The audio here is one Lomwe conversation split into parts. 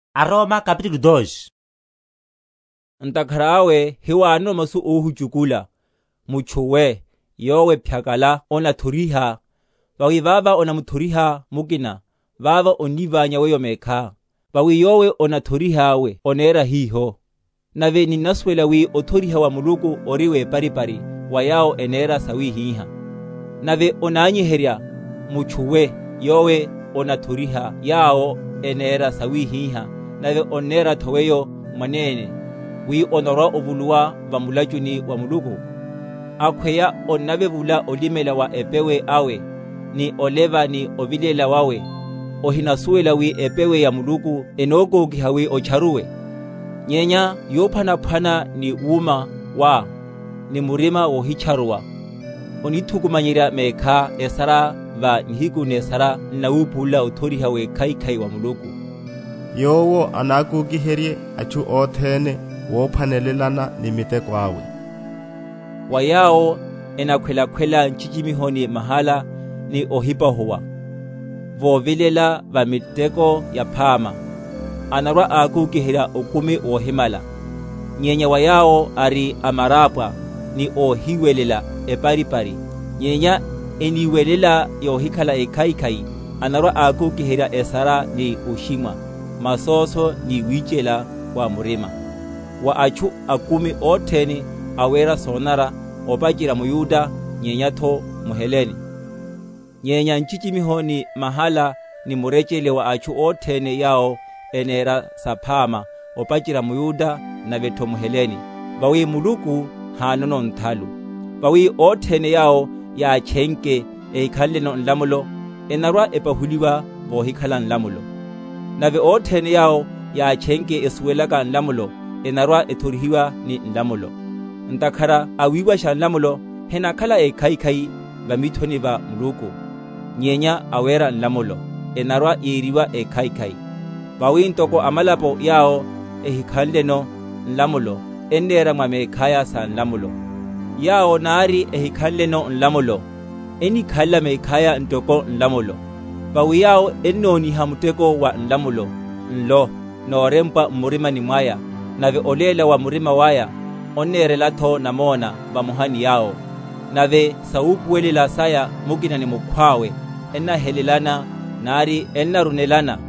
Wiwelela waya wa aYuda. Ntakhara awe hiwanono masu óhuchukula, mutchu we, yowe phyakala onathoriha; vawi vava onamuthorihá mukina, vavá onníványa weyo mekhá, vawi yowe onathoriha we onera hiho. Nave ninnasuwela wi othoriha wa Muluku ori weparipari wa yawo enera sawihiha. Nave onanyiherya, mutchu we, yowe onathoriha yawo enera sawihiha, nave onneratho weyo mwanene, wi onarwa‐ovuluwa va mulachuni wa Muluku? Akhweya onnavevula olimela wa epewe awe, ni oleva ni ovilela wawe, ohinasuwela wi epewe ya Muluku enokókiha wi otcharuwe? Nyenya yophwanaphwana ni wúma wá, ni murima wohitcharuwa, onithu?-?kumanyerya mekhá esara va nihiku nesara n’nawupulula othoriha wekhaikhai wa Muluku; yowo anakokiherye atchu othene wophwanelelana ni miteko awe; wa yawo, enakhwelakhwela nchichimiho ni mahala ni ohipahuwa, vovilela va miteko yaphama, anarwa‐akokiherya okumi wohimala; nyenya wa yawo ari amarápwa, ni óhiwelela eparipari, nyenya eniwelela yohikhala ekhaikhai, anarwa‐akokiherya esara ni oshimwa, masóso ni wichela wa murima, wa atchu akumi othene awera sonanara, opacherya mYuda, nyenyatho mHelene; nyenya nchichimiho ni mahala ni murechele wa atchu othene yawo enera saphama opacherya mYuda, navetho mHelene; vawi Muluku hánono nthalu. Vawi othene yawo yátchenke ehikhanleno nlamulo enarwa‐epahuliwa vohikhala nlamulo; nave othene yawo yátchenke esuwelaka nlamulo enarwa‐ethorihiwa ni nlamulo; ntakhara awiwasha nlamulo henakhala ékhaikhai va mithoni va Muluku, nyenya awera nlamulo enarwa‐yeriwa ékhaikhai. Vawi ntoko amalapo yawo ehinakhalano nlamulo, ennera mwa mekhaya sa nlamulo, yawo nari ehikhanleno nlamulo, enníkhalela mekhaya ntoko nlamulo; vawi yawo ennoniha muteko wa nlamulo nlo worempwa m’mirima mwaya, nave oléla‐wa‐murima waya onnerelatho namona vamoha ni yawo, nave sawupuwelela saya mukina ni mukhwawe ennahelelana nari ennarunelana;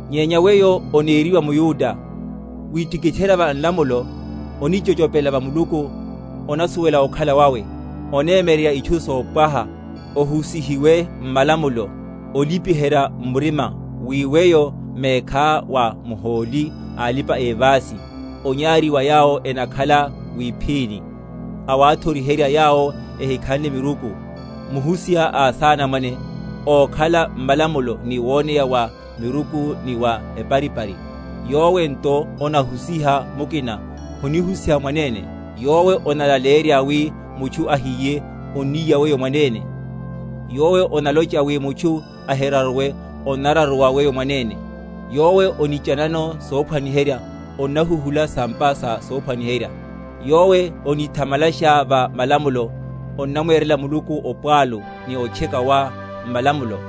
Nyenya weyo oneriwa mYuda, witikitherya va nlamulo, onichochopela va Muluku, onasuwela okhala wawe, onemyererya itchu sopwaha; ohusihiwe m’malamulo, olipiherya m’murima wi weyo mekhá wa muhóli a alipa‐evási, onyari wa yawo enakhala mwíphini, awathoriherya yawo ehikhanle miruku, muhusiha a asanamwane, ókhala m’malamulo ni woneya wa miruku ni wa eparipari; yowe nto onahusiha mukina, honihusiha mwanene? Yowe onalaleyerya wi mutchu ahíye, onníya weyo mwanene? Yowe onalocha wi mutchu ahiraruwe, onnararuwa weyo mwanene? Yowe onichanano sophwaniherya, onnahuhula sa’mpa sa sophwaniherya? Yowe onithamalasha va malamulo, onnamwerela Muluku opwalu ni otcheka wá m’malamulo?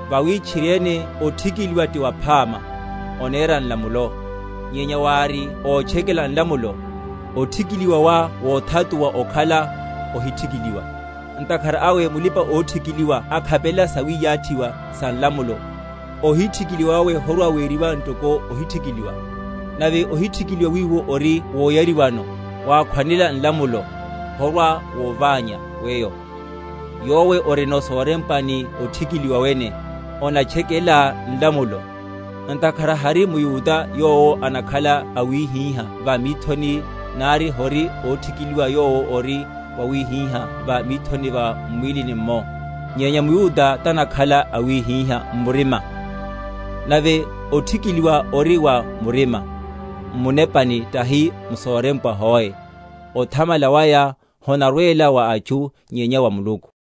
Vawi tchiriene othikiliwa ti waphama, onerá nlamulo; nyenya wári ótchekela nlamulo, othikiliwa wá wothatuwa okhala ohithikiliwa. Ntakhara awe mulipa‐othikiliwa akhapelela sawiyathiwa sa nlamulo, ohithikiliwa wawe horwa‐weriwa ntoko othikiliwa? Nave ohithikiliwa wiwo ori woyariwano, wakhwanela nlamulo, horwa‐wovanya weyo, yowe orinono sorempwa ni othikiliwa wene, onatchekelá nlamulo? Ntakhara hari mYuda yowo anakhala awihiha va mithoni, nari hori othikiliwa yowo ori wawihiha va mithoni, m’mwílini’mmo; nyenya mYuda tanakhala awihiha m’murima; nave othikiliwa ori wa murima, m’munepani, tahi m’sorempwa hoe; othamala waya honarwela wa atchu, nyenya wa Muluku.